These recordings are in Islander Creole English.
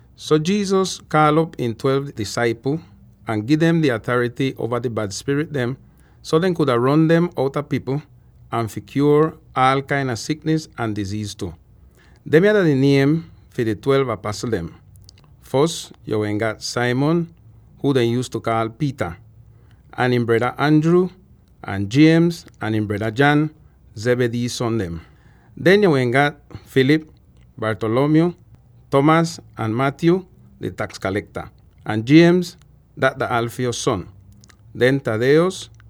So Jesus kaal'op ihn twelve disaipl ahn ihn gi dem di atarity uova di bad spirit dem, so dehn kuda ron dem outa pipl, ahn fi kyuor aal kain a siknis ahn diziiz tu. Demya dah di niem dem fi di twelve apasl dem: Fos yo wehn gat Simon —huu dehn yuuztu kaal Peter— ahn ihn breda Andrew, ahn James ahn ihn breda John —Zebedee son dem. Den yo wehn gat: Philip, Bartholomew, Thomas ahn Matthew —di taks kalekta, ahn James —dat dah Alphaeus son. Den Thaddaeus,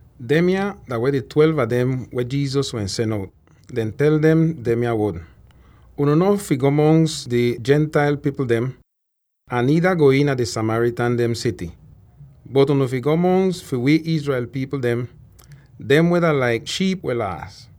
Demya dah wehn di twelve a dem weh Jesus wehn sen out, deh tel dem demya wod: “Unu no fi go mongs di Gentile pipl dem, ahn niida go iina di Samaritan dehn sity. Bot unu fi go mongs fi wi Israel pipl dem —dem weh dah laik shiip weh laas.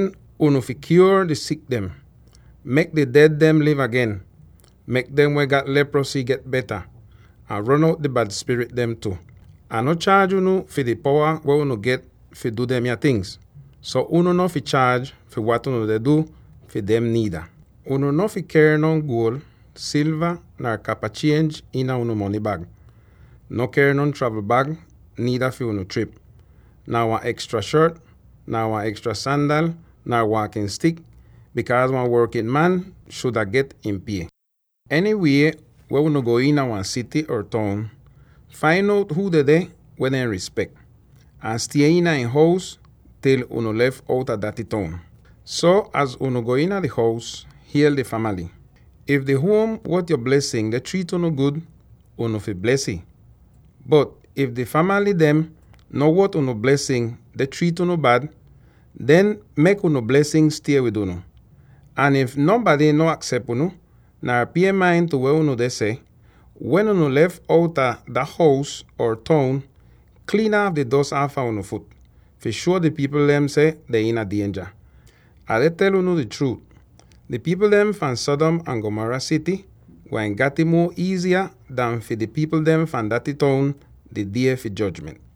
Den unu fi kyuor di sik dem, mek di ded dehn liv agen, mek dem weh gat leprosy get beta, ahn ron out di bad spirit dem tu. Ah no chaaj unu fi di powa weh unu gat fi du demya tingz; so unu no fi chaaj fi wat unu deh du fi dem niida. Unu no fi ker non guol, silva, nar kapa chienj iina unu mony bag, nar ker non travln bag niida fi unu trip, nar wan ekstra shot, nar ekstra sandal, nar waakin stik, bikaaz wan workin man shuda get ihn pie. “Enywie weh unu go iina wan sity or toun, fain out huu dedeh weh dehn rispek, ahn stie iina ihn hous til unu lef outa dah toun. So, az unu go iina di hous, hiel di famaly. If di huom wot yo blesin deh triit unu gud, unu fi bles ih. Bot if di famaly dehn no wot unu blesin deh triit unu bad, den mek unu blesin stie wid unu. Ahn if nonbady no aksep unu, nar pie main tu weh unu deh seh, wen unu lef outa dah hous or toun, kliin aaf di dos aafa unu fut, fi shuo di pipl dem seh dehn iina dienja. Ah deh tel unu di chruut: di pipl dem fahn Sodom ahn Gomorrah sity gwain gat'ih muo iiziya an fi di pipl dem fahn daty toun, di die fi jojment!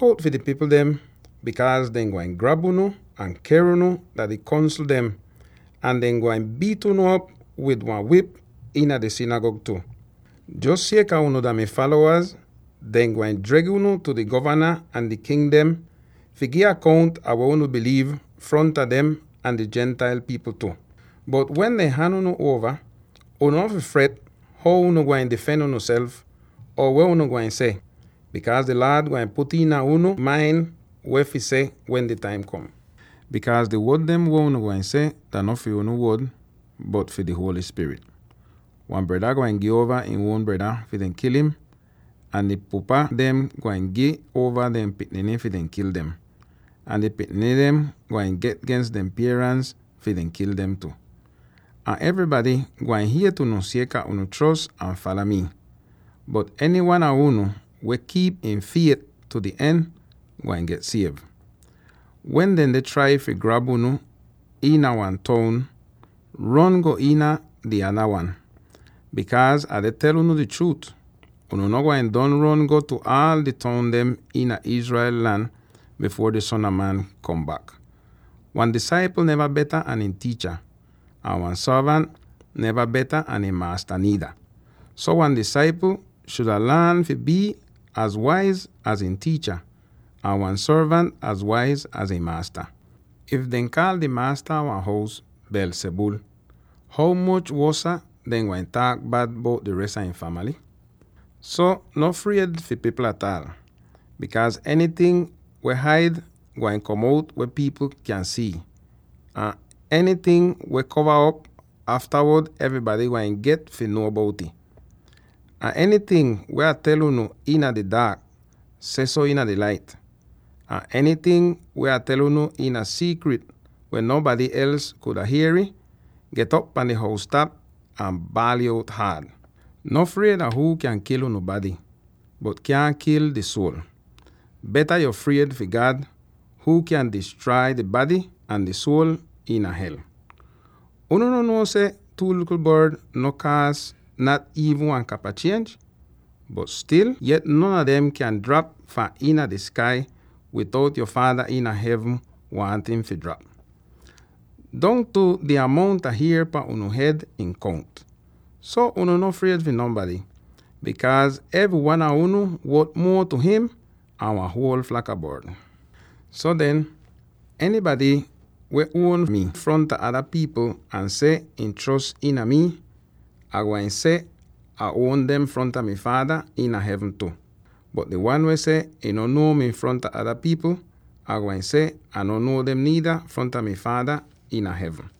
Luk out fi di pipl dem, bikaaz dehn gwain grab unu ahn ker unu dah di Kongsl dem, ahn dehn gwain biit unu op wid wan wip iina dehn sinigag tu. Jos sieka unu dah mi falowa, dehn gwain dreg unu tu di govana ahn di king dem fi gi akount ah weh unu biliiv fronta dem ahn di Gentile pipl tu. Bot wen dehn han unu uova, unu no fi fret how unu gwain difen unuself, or weh unu gwain seh, bikaaz di Laad gwain put iina unu main weh fi seh wen di taim kom. Bikaaz di wod dem weh unu gwain seh dah no fi unu wod, bot fi di Holy Spirit. “Wan breda gwain gi uova ihn uon breda fi dehn kil im, ahn di pupa dem gwain gi uova dehn pikniny fi dehn kil dem, ahn di pikniny dem gwain get gens dehn pierans fi dehn kil dem tu. Ahn evrybady gwain hiet unu sieka unu chros ahn fala mii. Bot enywan a unu weh kiip ihn fiet tu di en, gwain get siev. Wen dehn deh trai fi grab unu iina wan toun, ron go iina di nada wan. Bikaaz Ah deh tel unu di chruut: unu no gwain don ron go tu aal di toun dem iina Israel lan bifuor di Son a Man kom bak. “Wan disaipl neva beta an ihn tiicha, ahn wan sorvant neva beta an ihn maasta niida. So wan disaipl shuda laan fi bii az waiz az ihn tiicha, ahn wan sorvant az waiz az ihn maasta. If dehn kaal di maasta a wan hous ‘Beelzebul,’ ho moch wosa dehn gwain taak bad bout di res a ihn famaly! “So no fried fi pipl ataal. Bikaaz enyting weh haid, gwain kom out weh pipl kyan si'it, ahn enyting weh kova op, aftawod evrybady gwain get fi nuo bout'ih. Ahn enyting weh Ah tel unu iina di daak, sehso iina di lait, ahn enyting weh Ah tel unu iina siikrit weh nonbady els kuda hier'ih, get'op pahn di hous-tap ahn baal'ih out haad. No fried a huu kyan kil unu bady, bot kyaahn kil di suol. Beta yo fried fi God huu kyan distrai di bady ahn di suol iina hel. Unu no nuo seh two likl bord no kaas nat iivn wan kapa chienj? Bot stil yet non a dem kyaahn drap fahn iina di skai bitout yo Faada iina hevn waahn ih fi drap. Dongtu di amount a hier pan unu hed ihn kount! So unu no fried fi nonbady, bikaaz evry wan a unu wot muo tu him an wan huol flak a bord. “So den, enybady weh uon mi fronta ada pipl ahn seh ihn chros iina mi, Ah gwain seh Ah uon dem fronta mi Faada iina hevn tu. Bot di wan weh seh ihn no nuo mi fronta ada pipl, Ai gwain seh Ah no nuo im niida fronta mi Faada iina hevn.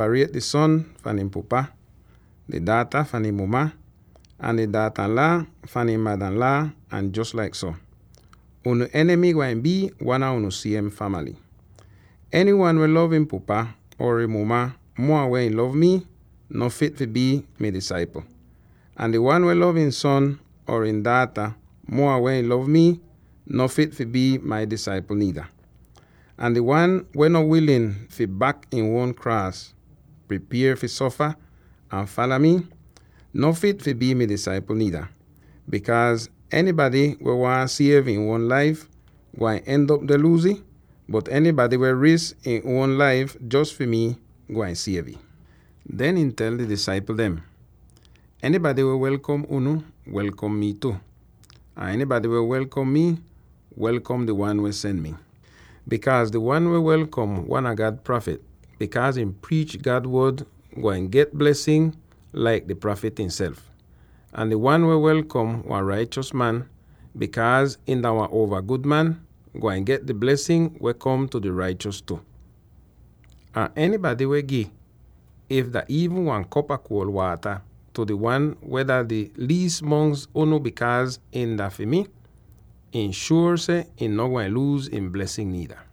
Bikaaz Ah kom fi separiet di son fahn ihn pupa, di daata fahn ihn muma, ahn di daatanlaa fahn ihn madanlaa, ahn jos laik so. Unu enimy gwain bii wan a unu siem famaly. “Enywan weh lov ihn pupa or ihn muma muo an weh ihn lov mii, no fit fi bii mi disaipl, ahn di wan weh lov ihn son or ihn daata muo an weh ihn lov mii, no fit fi bii mi disaipl niida. Ahn di wan weh no wilin fi bak ihn uon kraas —pripier fi sofa— ahn fala mi, no fit fi bii mi disaipl niida. Bikaaz enybady weh waahn siev ihn uon laif, gwain end'op deh luuz ih, bot enybady weh wi risk ihn uon laif jos fi mii, gwain siev ih.” Den ihn tel di disaipl dem, “Enybady weh welkom unu, welkom mii tu; ahn enybady weh welkom mi, welkom di wan weh sen mi. Bikaaz di wan weh welkom wan a God prafit bikaaz ihn priich God Wod gwain get bles laik di prafit ihnself, ahn di wan weh welkom wan raichos man, bikaaz ihn dah wehn wan uova gud man, gwain get di blesin weh kom tu di raichos tu. Ahn enybady weh gi, if dah iivn wan kop a kuol waata tu di wan weh dah di liis mongs unu bikaaz him dah fi mii, ih shuor seh ihn no gwain luuz ihn blesin niida.”